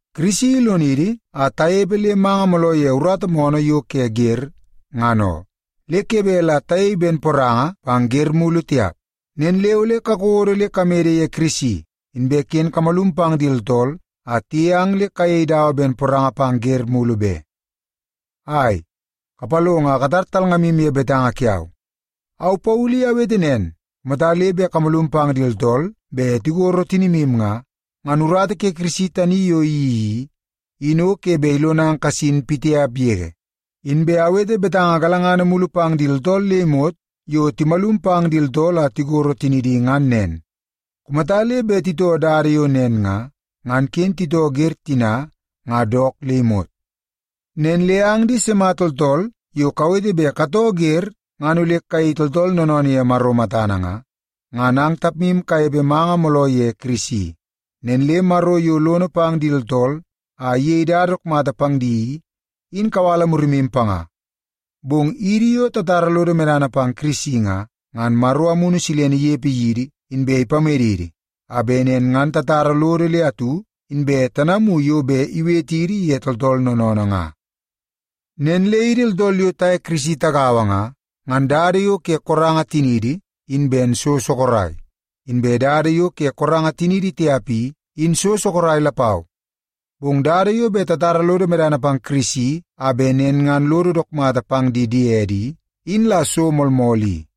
Kirisi ilonidi a tanepe le manga mooloo ye urata moonoo yo ke wer ngan oo. Le ke bet la tayei ben poranga pang wer mulu tiap. Nen le ole kakodo le kamede ye Kirisi, inbe ken kamalum pang di tooltool a tiyei ang le kayei dawa ben poranga pang wer mulu be. Ai, kapalongo a katar talngamu ye betanga kiau. Au Paulu i awete nen, kumata le bet kamalum pang di tooltool bet tikoro tinimu nga, ngan urata ke Kirisi tani yo iyeii i, in o ke bet ilonang kasin pitiap yege. Inbe awete betanga galangana mulu pang di tooltool le imot yo timalum pang di tooltool a tikoro tinidi ngan nen. Kumata le bet titoo dada yo nen nga, ngan ken titoo wer tina ngan dook le imot. Nen le ang di sima tooltool yo kawete bet katoo wer ngan ole kayei tooltool noonoonoo ye Maro matana nga, ngan ang tapmu kanepe manga mooloo ye Kirisi. Nen le Maro yo lono pang di tooltool a iyei dada dook mata pang di i, in kawala murimu panga. Bong idi yo tatara lodo medana pang Kirisi nga, ngan Maro Amunu Silene inepe yidi inbe ipamedidi a bet nen ngan tatara lodo le atu, inbe tanamu yo bet iwetidi ye tooltool noonoonoo nga. Nen le idi tooltool yo taye Yesu Kirisi tagaua nga, ngan dada yo ke koranga tiniidi in ben so sorok, inbe dada yo ke koranga tiniidi tiap i, in so sorok lapau. Bong dada yo bet tatara lodo medana pang Kirisi a bet nen ngan lodo dook mata pang di diede i, in la so moolmool i.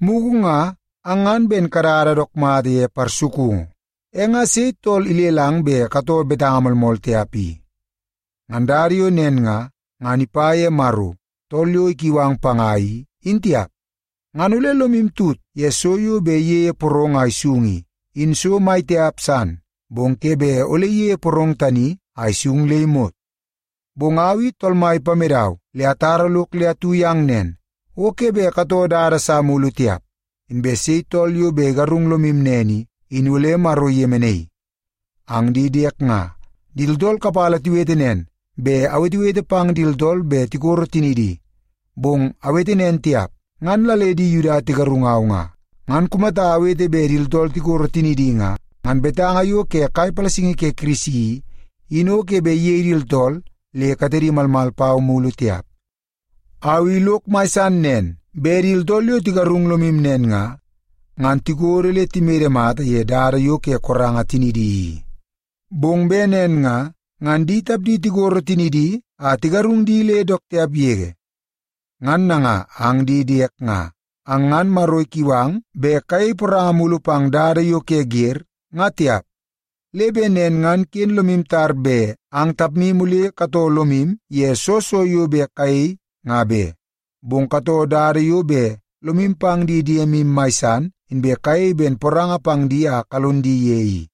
Mugu ngan ang ngan ben kadada dook mata ye parsukungu. E nga sei tool ilelang bet katoo betanga moolmool tiap i? Ngan dada yo nen nga, ngan ipa ye Maro, tool yo ikiu ang panga i, in tiap. Ngan ole lomu tut ye so yo bet iyeie porong a isung i, in so mai tiap san, bong ke bet ole iyeie porong tani a isung le imot. Bong au i Tool Mai ipamedau le atara lok le atu yang nen, o ke bet katoo dada sa mulu tiap. Inbe sei tool yo bet igarung lomu nen i, in ole Maro iyemenaii. Ang di diek nga, di tooltool kapala tiwete nen bet awetewete pang di tooltool bet tikoro tinidi. Bong awete nen tiap, ngan la le di Yuda tigarungau nga. Ngan kumata le awete bet di tooltool tikoro tinidi nga, ngan betanga yo ke kai palasingi ke Kirisi i, in o ke bet iyei di tooltool le katedi malmal pau mulu tiap. Au i lok mai san nen bet di tooltool yo tigarung lomu nen nga, ngan tikodo le timede mata ye dada yo ke koranga tinidi i. Bong bet nen nga, ngan di tapdi tikoro tinidi a tigarung di le dook tiap yege. Ngan nanga ang di diek nga, ang ngan Maro ikiu ang bet kayei poranga mulu pang dada yo ke wer, nga tiap. Le bet nen ngan ken lomu tar bet ang tapmu ole katoo lomu ye soo so yo bet kayei nga be. Bong katoo dada yo bet lomu pang di diemu ye mai san inbe kayei ben poranga pang di a kalon di ye i.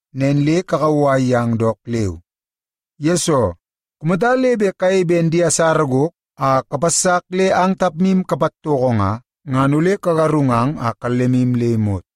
Nen le kakauwai yang dook leu. Yesoo, kumata le bet kayei ben di asara gok a kapassak le ang tapmu kapatoko nga, ngan ole kagarungang a kallemu le imot.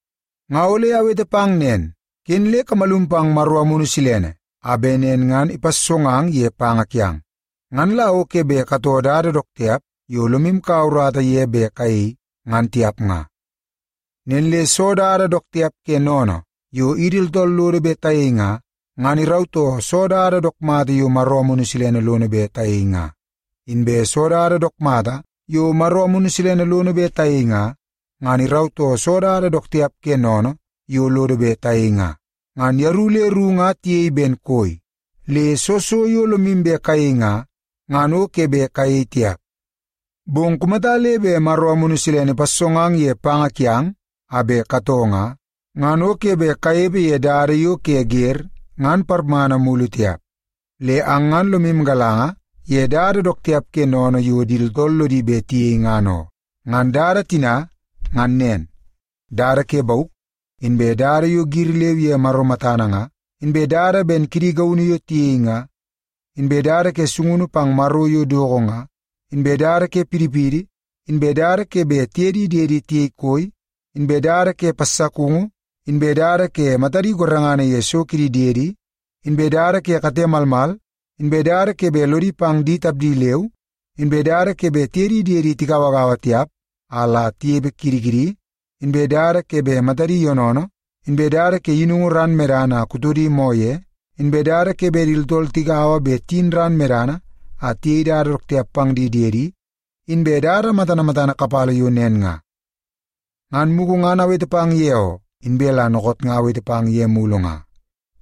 Nga ole awete pang nen, ken le kamalum pang Maro Amunu Silene a bet nen ngan ipassongang ye panga kiang. Ngan la o ke bet katoo dada dook tiap yo lomu kaua urata ye bet kayei, ngan tiap nga. Nen le soo dada dook tiap ke sennene yo idi tooltool lodo bet tayei nga, ngan irautoo soo dada dook mata yo Maro Amunu Silene lono bet tayei nga. Inbe soo dada dook mata yo Maro Amunu Silene lono bet tayei nga, ngan irautoo soo dada dook tiap ke sennene yo lodo bet tayei nga. Ngan yeru le ru nga tiyei ben koi, le soo so yo lomu bet kayei nga, ngan o ke bet kayei tiap. Bong kumata le bet Maro Amunu Silene ipassongang ye panga kiang a bet katoo nga, ngan o ke bet kanepe ye dada yo ke wer ngan parmana mulu tiap. Le ang ngan lomu galanga ye dada dook tiap ke sennene yo di tooltool lodi bet tiyei ngan oo. Ngan dada tina ngan nen: dada ke bauk, inbe dada yo giri leu ye Maro matana nga, inbe dada ben kidi gaunu yo tiyei nga, inbe dada ke sungunu pang maro yo doko nga, inbe dada ke pidipidi, inbe dada ke bet tiye di diedi tiyei koi, inbe dada ke passakungu, inbe dada ke matadi gorengana ye so kidi diedi, inbe dada ke kate malmal, inbe dada ke bet lodi pang di tapdi leu, inbe dada ke bet tiye di diedi tigauagaua tiap a la tinepe kidi kidi, inbe dada ke bet matadi yoonoonoo, inbe dada ke yinungu ran medana a kutodi moo ye, inbe dada ke bet di tooltool tigaua bet tiyin ran medana a tiyei dada dook tiap pang di diedi, inbe dada matana matana kapala yo nen nga. Ngan mugu ngan awete pang ye oo, inbe la dookoot nga awete pang ye mulu nga.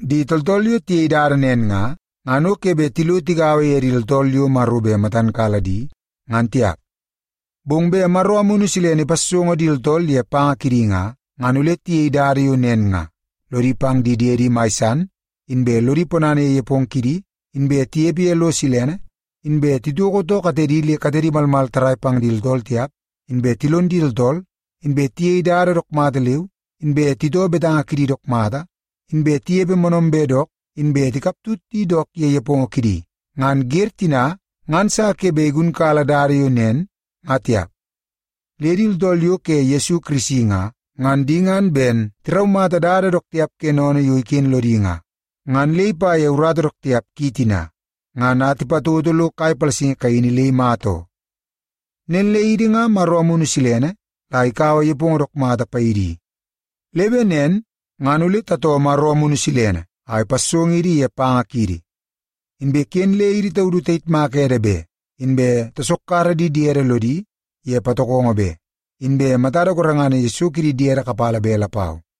Di tooltool yo tiyei dada nen nga, ngan o ke bet tilo tigaua ye di tooltool yo Maro bet matan kala di ngan tiap. Bong bet Maro Amunu Silene ipassongo di tooltool ye panga kidi nga, ngan ole tiyei dada yo nen nga: lodi pang di diede mai san, inbe lodi ponana ye nepongo kidi, inbe tinepe ye lo silene, inbe titoko too katedi le katedi malmal tarrai pang di tooltool tiap, inbe tilon di tooltool, inbe tiyei dada dook mata leu, inbe titoo betanga kidi dook mata, inbe tinepe moonoombe dook, inbe tikaptut di dook ye nepongo kidi. Ngan wer tina nga atu sa ke bet igunkala dada yo nen ngan tiap. Le di tooltool yo ke Yesu Kirisi nga, ngan di ngan ben tiraumata dada dook tiap ke sennene yo iken lodi nga, ngan le ipa ye urata dook tiap ki tina, ngan a tipatoto lo kai palasingi kaini le imata oo. Nen le idi nga Maro Amunu Silene la ikaua nepongo dook mata paidi i. Le bet nen ngan ole tatoo Maro Amunu Silene a ipassongidi ye panga kiidi. Inbe ken le idi taudu tayitmak ede be, inbe tasokkara di diede lodi ye patokongo be, inbe matada gorengana ye so kidi diede kapala be lapau.